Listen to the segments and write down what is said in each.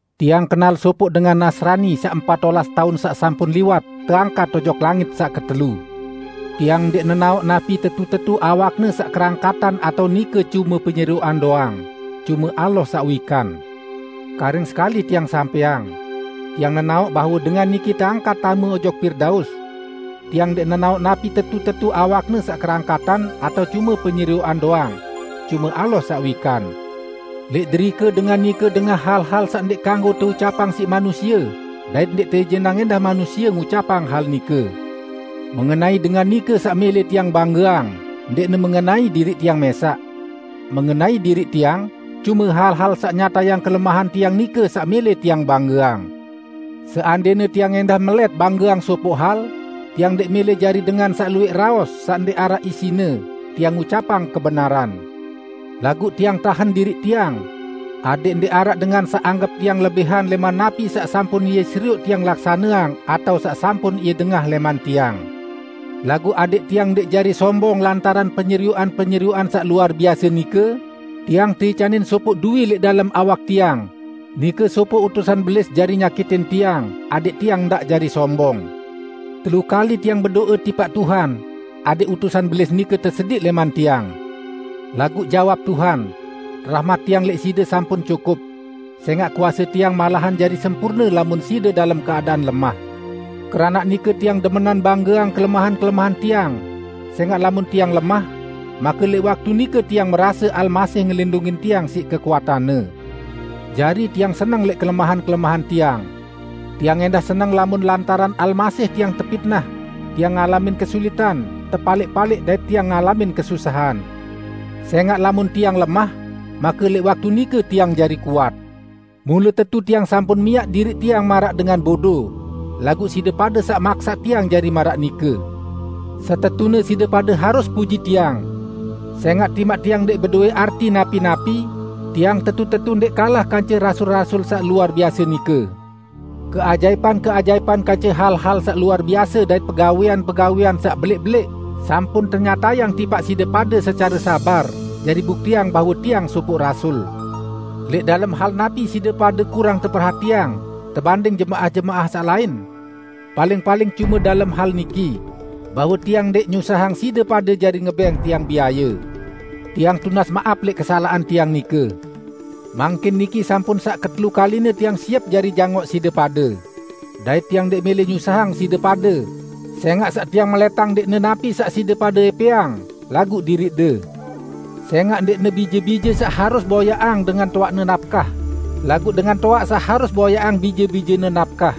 Tiang kenal sopoq dengan Nasrani saq empat olas taun saq sampun liwat teangkat ojok langit saq ketelu. (Tiang ndẽq nenaoq napi tetu-tetu awakne saq kerangkatan atao nike cume penyerioqan doang -- cume Allah saq wikan.) Karing sekali tiang sampẽang: Tiang nenaoq bahwe dengan niki teangkat tame ojok Pirdaus. (Tiang ndẽq nenaoq napi tetu-tetu awakne saq kerangkatan atao cume penyerioqan doang -- cume Allah saq wikan.) Lẽq derike dengan nike dengah hal-hal saq ndẽq kanggo teucapang siq manusie dait ndẽq teijinang ẽndah manusie ngucapang hal nike. Mengenai dengan nike saq mẽlẽ tiang banggeang, ndẽqne mengenai diriq tiang mẽsaq. Mengenai diriq tiang, cume hal-hal saq nyatayang kelemahan tiang nike saq mẽlẽ tiang banggeang. Seandẽne tiang ẽndah melẽt banggeang sopoq hal, tiang ndẽq mẽlẽ jari dengan saq luwẽq raos saq ndẽq araq isine; tiang ngucapang kebenaran. Laguq tiang tahen diriq tiang, adẽq ndẽq araq dengan saq anggep tiang lebihan lẽman napi saq sampun ie serioq tiang laksaneang atao saq sampun ie dengah lẽman tiang. Laguq adẽq tiang ndẽq jari sombong lantaran penyerioqan-penyerioqan saq luar biase nike, tiang teicanin sopoq duwi lẽq dalem awak tiang, nike sopoq utusan Belis jari nyakitin tiang, adẽq tiang ndaq jari sombong. Telu kali tiang bedo'e tipaq Tuhan adẽq utusan Belis nike tesediq lẽman tiang. Laguq jawab Tuhan, "Rahmat Tiang lẽq side sampun cukup; sẽngaq kuase Tiang malahan jari sempurne lamun side dalem keadaan lemah." Keranaq nike tiang demenan banggeang kelemahan-kelemahan tiang, sẽngaq lamun tiang lemah, make lẽq waktu nike tiang merase Almasih ngelindungin tiang siq kekuatan-Ne. Jari tiang seneng siq kelemahan-kelemahan tiang. Tiang ẽndah seneng lamun lantaran Almasih tiang tepitnah, tiang ngalamin kesulitan, tepalẽq-palẽq dait tiang ngalamin kesusahan. Sẽngaq lamun tiang lemah, make lẽq waktu nike tiang jari kuat. Mule tetu tiang sampun miaq diriq tiang maraq dengan bodo -- laguq side pade saq maksaq tiang jari maraq nike. Setetune side pade harus puji tiang. Sẽngaq timaq tiang ndẽq bedowẽ arti napi-napi, tiang tetu-tetu ndẽq kalah kance "rasul-rasul" saq luar biase nike! Keajaipan-keajaipan kance hal-hal saq luar biase dait pegawẽan-pegawẽan saq belẽq-belẽq sampun tenyatayang tipaq side pade secare sabar, jari buktiang bahwe tiang sopoq rasul. Lẽq dalem hal napi side pade kurang teperhatiang, tebanding jemaah-jemaah saq lain? Paling-paling cume dalem hal niki: Bahwe tiang ndẽq nyusahang side pade jari ngebẽng tiang biaye. Tiang tunas maap lẽq kesalaqan tiang nike! Mangkin niki sampun saq ketelu kaline tiang siep jari jangoq side pade. Dait tiang ndẽq mẽlẽ nyusahang side pade, sẽngaq saq tiang melẽtang ndẽqne napi saq side pade ẽpẽang, laguq diriqde. Sẽngaq ndẽqne bije-bije saq harus boyaqang dengan toaqne napkah, laguq dengan toaq saq harus boyaqang bije-bijene napkah.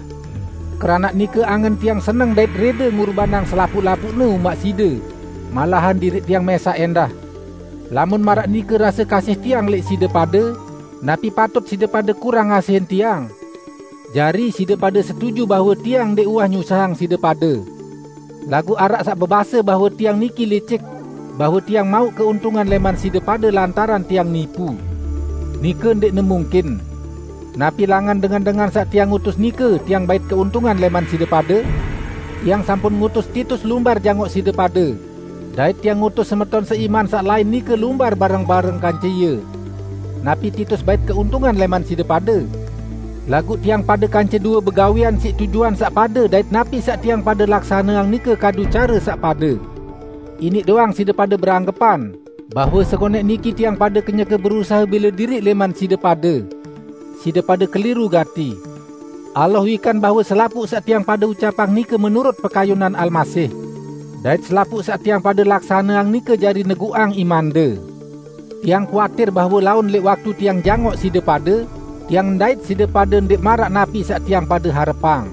Keranaq nike, angen tiang seneng dait rẽde ngurbanang selapuq-lapuqne umaq side, malahan diriq tiang mẽsaq ẽndah. Lamun maraq nike rase kasih tiang lẽq side pade, napi patut side pade kurang ngasihin tiang? Jari, side pade setuju bahwe tiang ndẽq uwah nyusahang side pade. Laguq araq saq bebase bahwe tiang niki licik; bahwe tiang mauq keuntungan lẽman side pade lantaran tiang nipu. Nike ndẽqne mungkin! Napi langan dengan-dengan saq tiang utus nike tiang bait keuntungan lẽman side pade? Tiang sampun ngutus Titus lumbar jangoq side pade, dait tiang ngutus semeton seiman saq lain nike lumbar bareng-bareng kance ie. Napi Titus bait keuntungan lẽman side pade? Laguq tiang pade kance due begawẽan siq tujuan saq pade dait napi saq tiang pade laksaneang nike kadu care saq pade! Iniq doang side pade beranggepan bahwe sengonẽq niki tiang pade kenyeke berusahe bẽle diriq lẽman side pade. Side pade keliru gati! Allah wikan bahwe selapuq saq tiang pade ucapang nike menurut pekayunan Almasih. Dait selapuq saq tiang pade laksaneang nike jari neguqang imande. Tiang kuatir bahwe laun lẽq waktu tiang jangoq side pade, tiang ndait side pade ndẽq maraq napi saq tiang pade harepang.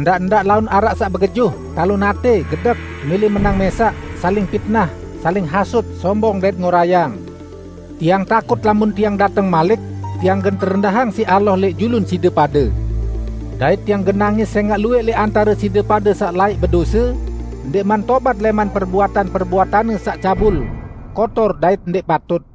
Ndaq-ndaq laun araq saq begejuh, talon atẽ, gedek, mẽlẽ menang mẽsaq, saling pitnah, saling hasut, sombong dait ngorayang. Tiang takut lamun tiang dateng malik, tiang gen terendahang siq Allah lẽq julun side pade, dait tiang gen nangis sẽngaq luwẽq lẽq antare side pade saq laẽq bedose, ndẽqman tobat lẽman perbuatan-perbuatanne saq cabul, kotor dait ndẽq patut.